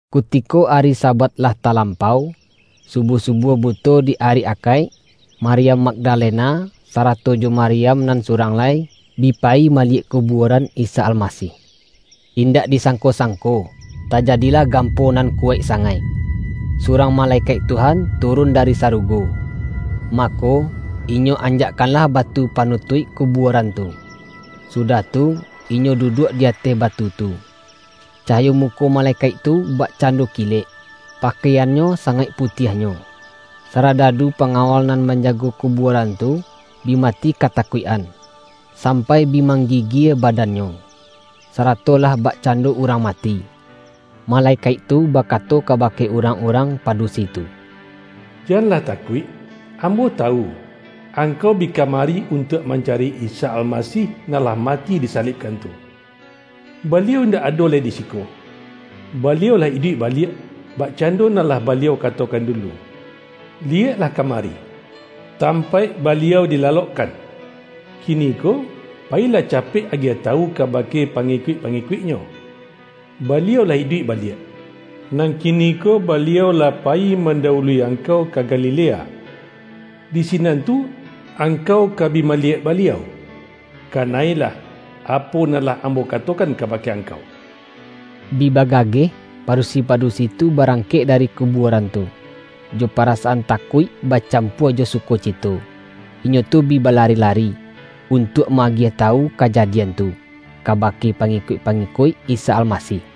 Kutiko ari Sabat lah talam-pau, subuah-subuah buto di ari Akaik, Maryam Magdalena, sara-to jo Maryam nan surang lai, bi pa-yi maliyek kubuaran Isa Almasih. Indak disangko-sangko, tajadilah gampo nan kuwaik sangaik. Surang malekaik Tuhan turun dari sarugo, mako, inyo anjakkanlah batu panu-tuik kubuaran tu, sudah tu, inyo du-duak di ateh batu tu. Cahayo muko malekaik tu bakcando kilek, pakai-annyo sangaik putiahnyo. Saradadu pangawal nan manjago kubuaran tu, bi mati katakuik-an, sampai bi mang-gigie badannyo, sarato lah bakcando urang mati. Malekaik tu bakato kabake urang-urang padusi tu,”Janlah takuik! Ambo tawu, angkau bi kamari untuak mancari Isa Almasih nan lah mati disa-libkan tu. Baliau indak ado lai di si-ko. Baliau lah iduik baliak, bakcando nan lah Baliau katokan dulu. Liyeklah kamari, tampaik Baliau dilalokkan. Kiniko, payilah capek agiah tawu ka-bake pangikuik-pangikuik-Nyo, ’Ba-liau lah iduik baliak, nan kiniko Ba-liau lah payi mandawului angkau ka Galilea. Di sinan tu, angkau ka bi ma-liyek Baliau!’ Kana-ilah, apo nan lah ambo katokan kabake angkau.” Bi bagageh, padusi-padusi tu barangkek dari kubuaran tu. Jo pa-rasaan takuik bacampua jo sukocito, inyo tu bi balari-lari, untuak ma-agiah tawu kajadian tu, kabake pangikuik-pangikuik Isa Almasih.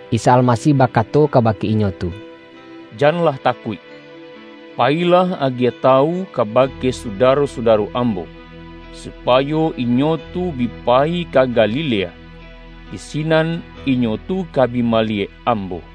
Isa Almasih bakato kabake inyo tu,”Janlah takuik, payilah agiah tawu kabake sudaro-sudaro Ambo, su-payo inyo tu bi payi ka Galilea; di si-nan inyo tu ka bi maliyek Ambo.”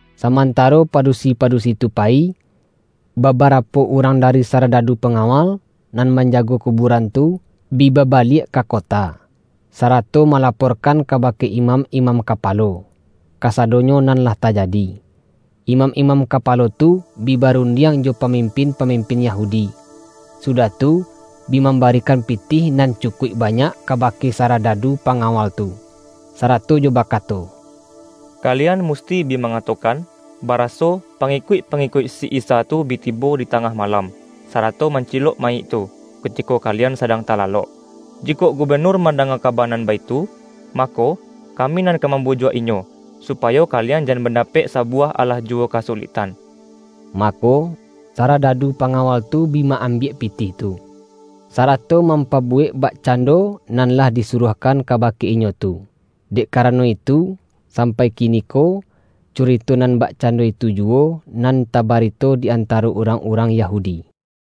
Samantaro padusi-padusi tu payi, babarapo urang dari saradadu panga-wal nan manjago kubuaran tu, bi ba-baliak ka kota, sarato malaporkan ka-bake imam-imam kapalo, kasadonyo nan lah tajadi. Imam-imam kapalo tu, bi barundiang jo pamimpin-pamim-pin Yahudi, sudah tu, bi mambarikan pitih nan cukuik banyak kabake sara-dadu pangawal tu, sarato jo bakato,”Kalian musti bi mangatokan, baraso, pangikuik-pangikuik si Isa tu bi tibo di tangah malam, sarato mancilok ma-yik tu, kutiko kalian sadang talalok. Jikok gubenur mandanga kaba nan baitu, mako, kami nan ka mambujuak inyo, supayo kalian jan mandapek sa-buwah alah juwo kasuliktan.” Mako, saradadu pangawal tu bi ma-ambiak pitih tu, sarato mampa-buwek bakcando nan lah disuruah-kan kabake inyo tu. Dek karano itu, sampai kiniko, curito nan bakcando itu juwo, nan tabarito di antaro urang-urang Yahudi.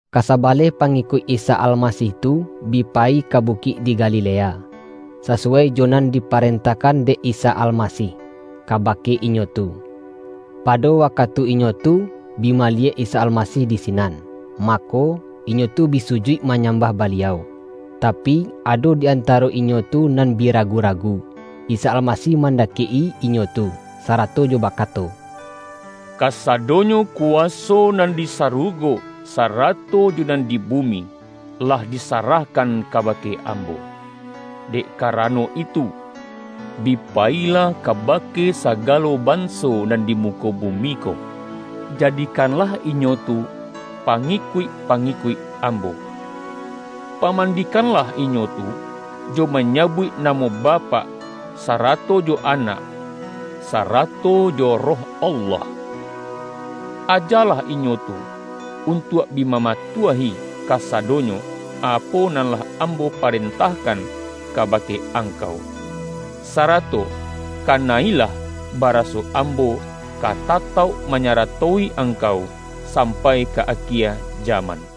Kasabaleh pangikuik Isa Almasih tu, bi payi ka bukik di Galilea, sa-suwai jo nan diparentahkan dek Isa Almasih, kabake inyo tu. Pado wa-katu inyo tu bi maliyek Isa Almasih di sinan, mako, inyo tu bi sujuik ma-nyambah Baliau. Tapi, ado di anta-ro inyo tu nan bi ragu-ragu. Isa Almasih mandakek-i inyo tu, sarato jo bakato,”Kasadonyo kuwaso nan di sarugo, sarato jo nan di bumi, lah di-sarahkan kabake Ambo. Dek kara-no itu, bi payilah kabake sagalo ban-so nan di muko bumi ko, jadikanlah inyo tu pangikuik-pangikuik Ambo. Pamandikanlah inyo tu, jo manyabuik namo Bapak, sarato jo Anak, sarato jo Roh Allah. Ajalah inyo tu untuak bi mamatuahi kasadonyo, apo nan lah Ambo parentahkan kabake ang-kau. Sarato kana-ilah, baraso Ambo ka tatauk manyarato-i angkau, sam-pai ka akie jaman.”